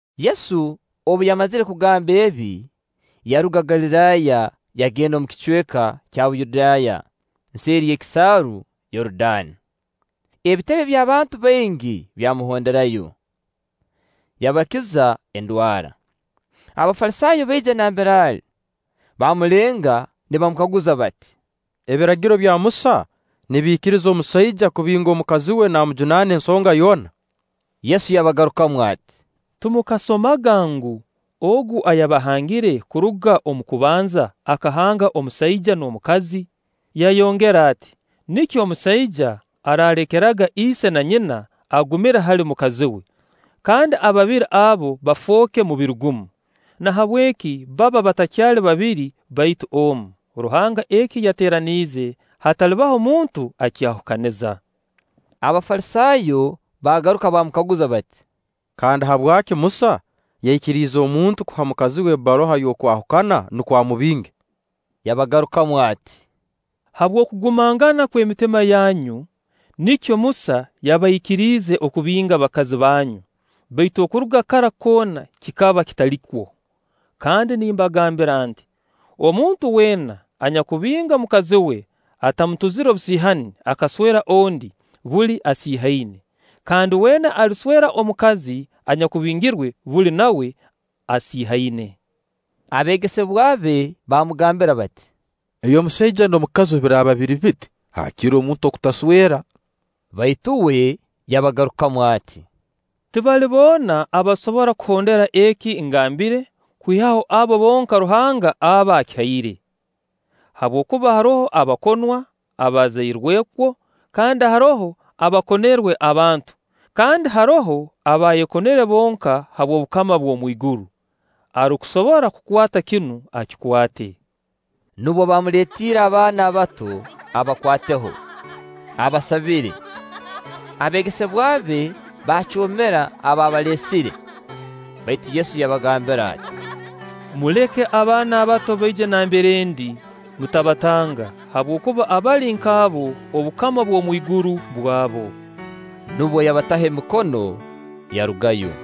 Yesu obu yamazire kugamba ebi, yaruga Galiraaya yagenda omu kicweka kya Buyudaaya nseeri y'ekisaaru Yorudaani; ebitebe by'abantu baingi byamuhonderayo, yabakiza endwara. Abafalisaayo baija nambere ali, baamulenga nibamukaguza bati: “Ebiragiro bya Musa nibiikiriza omusaija kubinga mukazi we naamujunaana ensonga yoona?” Yesu yabagarukamu ati: “Timukasomaga ngu, Ogu ayabahangire kuruga omu kubanza, akahanga omusaija n'omukazi? Yayongera ati: ‘Nikyo omusaija araalekeraga ise na nyina agumire hali mukazi we, kandi ababiri abo bafooke mubiri gumu.’ Nahabweki baba batakyali babiri, baitu omu Ruhanga eki yateeraniize, hatalibaho muntu akyahukaniza.” Abafalisaayo baagaruka baamukaguza bati: “Kandi habwaki Musa yaikiriize omuntu kuha mukazi we ebbaruha y'okwahukana, nukwo amubinge?” Yabagarukamu ati: “Habw'okugumangana kw'emitima yanyu nikyo Musa yabaikiriize okubinga bakazi banyu, baitu okuruga kara koona kikaba kitalikwo. Kandi nimbagambira nti: Omuntu weena anyakubinga mukazi we atamutuzire obusiihani, akaswera ondi, buli asiihaine; kandi weena aliswera omukazi anyakubingirwe, buli nawe asiihaine.” Abeegesebwa be baamugambira bati: “Eby'omusaija n'omukazi obu biraaba biri biti, haakire omuntu okutaswera.” Baitu uwe yabagarukamu ati: “Tibali boona abasobora kuhondera eki ngambire, kwihaho abo bonka Ruhanga aba akihaire. Habwokuba haroho abakonwa abaazairwe kwo, kandi haroho abaakonerwe abantu, kandi haroho abaayekonere bonka habw'obukama bw'omwiguru. Arukusobora kukwata kinu, akikwate.” Nubwo baamuleetiire abaana abato abakwateho, abasabire. Abeegesebwa be baacoomera ababalesire; baitu Yesu yabagambira ati: “Muleke abaana bato baije nambere ndi, mutabatanga; habwokuba abali nk'abo, obukama bw'omwiguru bwabo.” Nubwo yabataho emikono, yarugayo.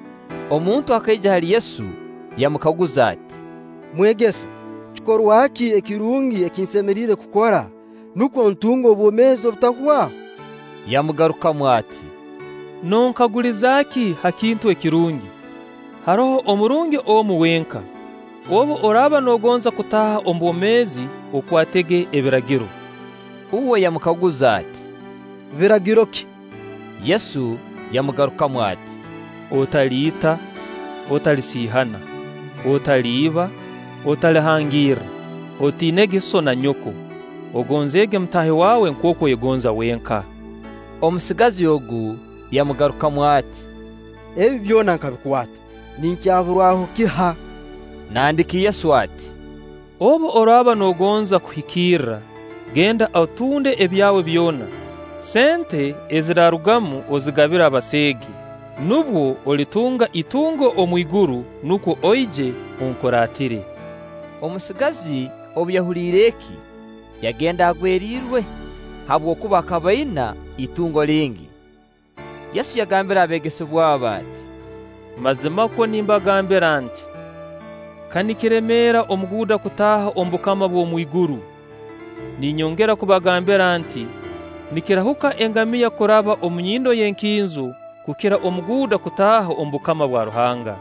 Omuntu akaija hali Yesu, yamukaguza ati: “Mwegesa, kikorwa ki ekirungi eki nsemeriire kukora, nukwo ntunge obwomeezi obutahwaho?” Yamugarukamu ati: “Nonkaguliza ki ha kintu ekirungi? Haroho omurungi omu wenka. Obu oraaba noogonza kutaaha omu bwomeezi, okwatege Ebiragiro.” Uwe yamukaguza ati: “Biragiro ki?” Yesu yamugarukamu ati: “Otaliita. Otalisiihana. Otaliiba. Otalihangirra. Otiinege sso na nyoko. Ogonzeege mutaahi wawe nkooku oyegonza wenka.” Omusigazi ogu yamugarukamu ati: “Ebi byona nkabikwata, ninkuyaburwaho kiha?” Nandiki Yesu ati: “Obu oraaba noogonza kuhikirra, genda otunde ebyawe byona, sente eziraarugamu ozigabire abaseege, nubwo olitunga itungo omwiguru; nukwo oije onkuraatire.” Omusigazi obu yahuliire eki, yagenda agwerirwe, habwokuba akaba aina itungo lingi. Yesu yagambira abeegesebwa be ati: “Mazimakwo nimbagambira nti: Ka nikiremeera omuguuda kutaaha omu bukama bw'omwiguru. Ninyongera kubagambira nti: Nikirahuka engamiya kuraba omu nyindo y'enkinzo, kukira omuguuda kutaaha omu bukama bwa Ruhanga.”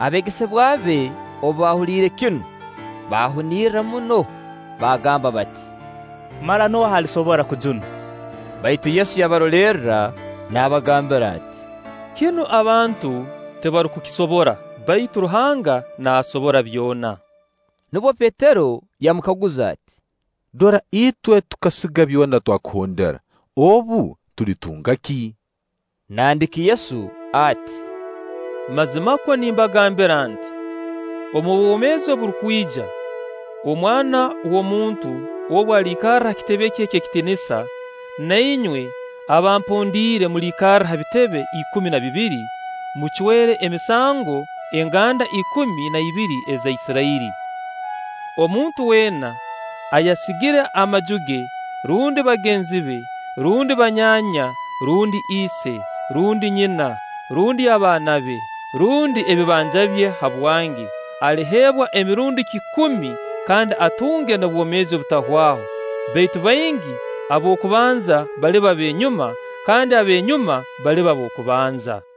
Abeegesebwa be obu baahuliire kinu, baahunirra muno, baagamba bati: “Mara nooha alisobora kujunwa?” Baitu Yesu yabarolerra naabagambira ati: “Kinu abantu tibarukukisobora, baitu Ruhanga naasobora byona.” Nubwo Petero yamukaguza ati: “Dora itwe tukasiga byona twakuhondera; obu, tulitunga ki?” Nandiki Yesu ati: “Mazimakwo nimbagambira nti: Omu bwomeezi oburukwija, Omwana w'omuntu obu aliikarra ha kitebe kye eky'ekitiinisa, na inywe abampondiire mulikarra ha bitebe ikumi na bibiri, mucwere emisango enganda ikumi na ibiri eza Isirairi. Omuntu weena ayasigire amaju ge, rundi bagenzi be, rundi banyaanya, rundi ise, rundi nyina, rundi abaana be, rundi ebibanja bye habwange, aliheebwa emirundi kikumi, kandi atunge n'obwomeezi obutahwaho. Baitu baingi ab'okubanza baliba b'enyuma, kandi ab'enyuma baliba b'okubanza.”